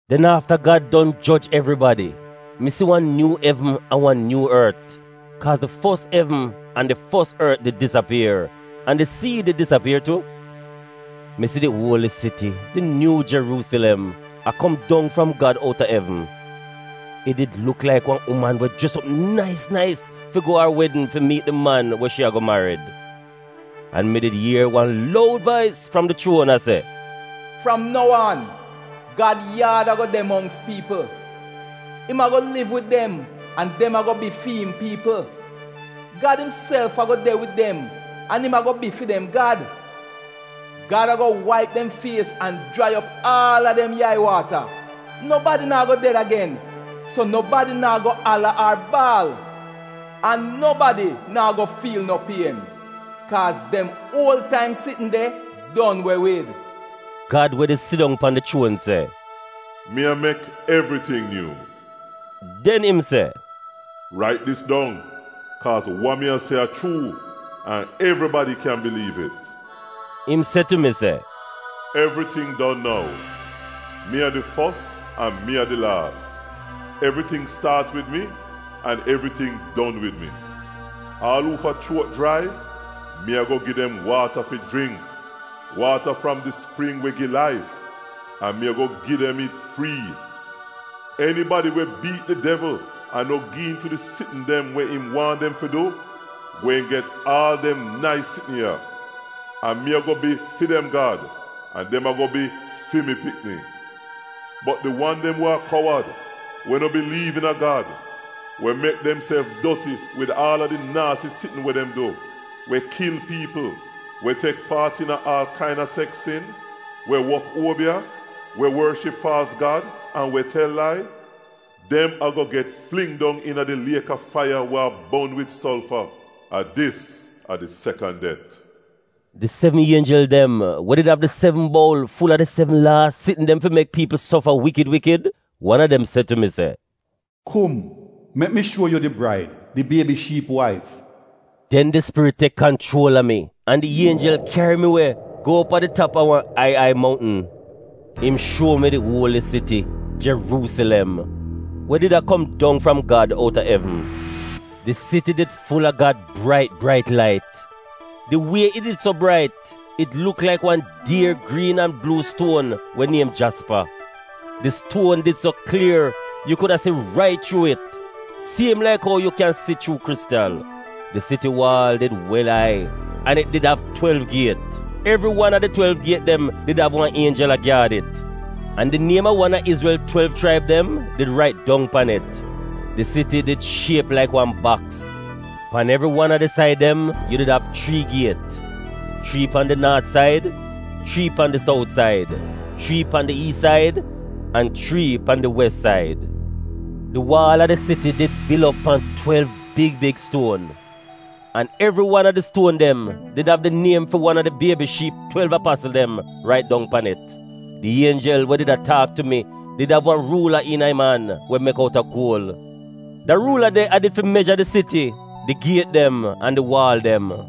Den afta Gad don joj evribadi, mi si wan nyuu evn an wan nyuu ort, kaaz di fos evn an di fos ort did disapier, an di sii did disapier tu. Mi si di uoli siti, di nyuu Jeruusilem, a kom dong fram Gad outa evn. It did luk laik wan uman we jres op nais nais fi go a ar wedn fi miit di man we shi a-go marid. An mi did ier wan loud vais fram di chuon a se, “Fram nou aan Gad yaad a-go de mongks piipl. Im a-go liv wid dem an dem a-go bi fi'im piipl. Gad imself a-go de wid dem an im a-go bi fi dem Gad. Gad a-go waip dem fies an jrai op aal a dem yai-waata. Nobadi naa go ded agen, so nobadi naa go ala ar baal. An nobadi naa go fiil no pien, kaaz dem uol taim sitn de don we wid.” Gad we did sidong pan di chuon se, “Mi a mek evriting nyuu!” Den im se, “Rait dis dong, kaaz wa mi a se a chuu an evribadi kyan biliiv it.” Im se tu mi se, “Evriting don nou. Mi a di fos an mi a di laas. Evriting staat wid mi an evriting don wid mi. Aal uufa chuot jrai, mi a-go gi dem waata fi jringk — waata fram di spring we gi laif, an mi a-go gi dem it frii. Enibadi we biit di devl an no gi iin tu di sitn dem we im waahn dem fi du, gweehn get aal dem nais sitn ya. An mi a-go bi fi dem Gad an dem a-go bi fi mi pikni. Bot di wan dem we a kowad, we no biliiv iina Gad, we mek demself doti wid aal a di naasi sitn we dem du, we kil piipl, we tek paat iina aal kain-a seks sin, we wok uobiya, we worship faalz gad an we tel lai — dem a-go get fling dong iina di liek a faiya we a bon wid solfa. A dis a di sekan det.” Di sevn ienjel dem we did av di sevn boul ful-a di sevn laas sitn dem fi mek piipl sofa wikid wikid, wan a dem se tu mi se, “Kum, mek mi shuo yu di braid, di Biebi Shiip waif.” Den di Spirit tek kanchuol a mi an di ienjel kyari mi we go op a di tap a wan ai ai mountn. Im shuo mi di uoli siti, Jeruusilem, we did a kom dong fram Gad, outa evn. Di siti did ful-a Gad brait brait lait. Di wie it did so brait, it luk laik wan dier griin an bluu stuon we niem jaspa. Di stuon did so klier, yu kuda si rait chuu it, siem laik ou yu kyan si chuu kristal. Di siti waal did wel ai an it did av twelv giet. Evri wan a di twelv giet dem did av wan ienjel a gyaad it, an di niem a wan a Izrel twelv chraib dem did rait dong pan it. Di siti did shiep laik wan baks. Pan evri wan a di said dem, yu did av chrii giet: chrii pan di naat said, chrii pan di sout said, chrii pan di iis said, an chrii pan di wes said. Di waal a di siti did bil op pan twelv big big stuon. An evri wan a di stuon dem did av di niem fi wan a di Biebi Shiip twelv apasl dem rait dong pan it. Di ienjel we did a taak tu mi did av wan ruula iina im an we mek outa guol. Da ruula de a did fi meja di siti, di giet dem an di waal dem.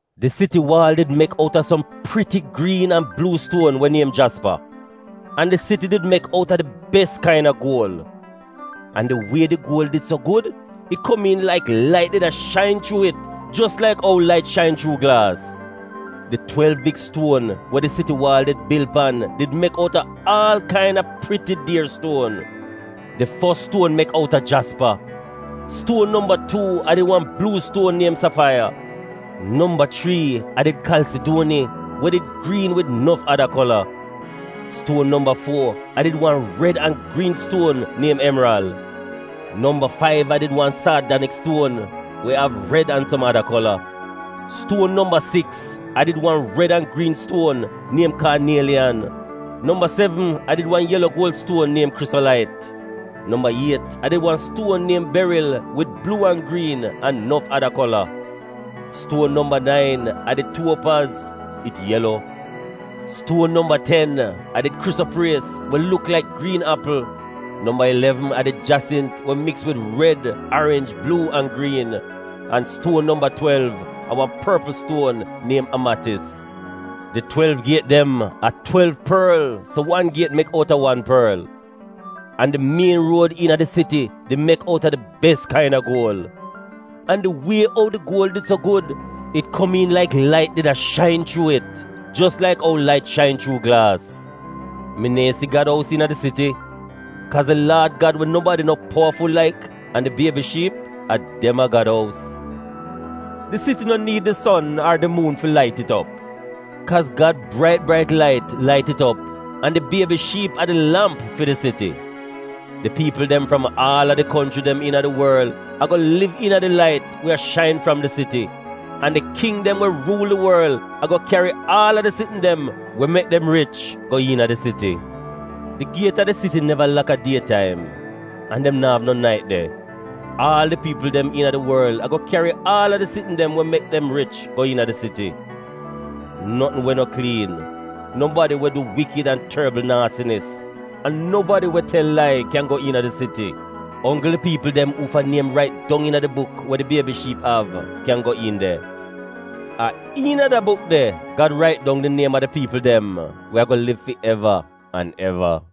Di siti waal did mek outa som priti griin an bluu stuon we niem jaspa. An di siti did mek outa di bes kain-a guol. An di wie di guol did so gud, it komiin laik lait did a shain chuu it jos laik ou lait shain chuu glaas. Di twelv big stuon we di siti waal did bil pan did mek outa aal kain-a priti dier stuon. Di fos stuon mek outa jaspa, stuon nomba tuu a did wan bluu stuon niem safaiya, nomba chrii a did kalsiduoni we did griin wid nof ada kola, stuon nomba fuo a did wan red an griin stuon niem emral, nomba faiv a did wan saadaniks stuon we av red an som ada kola, stuon nomba siks a did wan red an griin stuon niem kaanieliyan, nomba sevn a did wan yelo guol stuon niem krisolait, nomba iet a did wan stuon niem beril wid bluu an griin an nof ada kola, stuon nomba nain a did tuopaz — it yelo, stuon nomba ten a did krisopries we luk laik griin apl, nomba ilevn a did jasint we miks wid red, arinj, bluu an griin, an stuon nomba twelv a wan porpl stuon niem amatis. Di twelv giet dem a twelv porl, so wan giet mek outa wan porl. An di mien ruod iina di siti di mek outa di bes kain-a guol. An di wie ou di guol did so gud, it komiin laik lait did a shain chuu it jos laik ou lait shain chuu glaas. Mi neehn si Gad ous iina di siti, kaaz di Laad Gad we nobadi no powaful laik an di Biebi Shiip, a dem a Gad ous. Di siti no niid di son ar di muun fi lait it op, kaaz Gad brait brait lait, lait it op, an di Biebi Shiip a di lamp fi di siti. Di piipl dem fram aal a di konchri dem iina di worl a-go liv iina di lait we a shain fram di siti, an di king dem we ruul di worl a-go kyari aal a di sitn dem we mek dem rich go iina di siti. Di giet fi di siti neva lak a die taim (an dem no av no nait de). Aal di piipl dem iina di worl a-go kyari aal a di sitn dem we mek dem rich go iina di siti. Notn we no kliin, nobadi we du wikid an torbl naasinis, an nobadi we tel lai kyan go iina di siti. Onggl di piipl dem uufa niem rait dong iina di buk we di Biebi Shiip av kyan go iin de. A iina da buk de Gad rait dong di niem a di piipl dem we a-go liv fi eva an eva.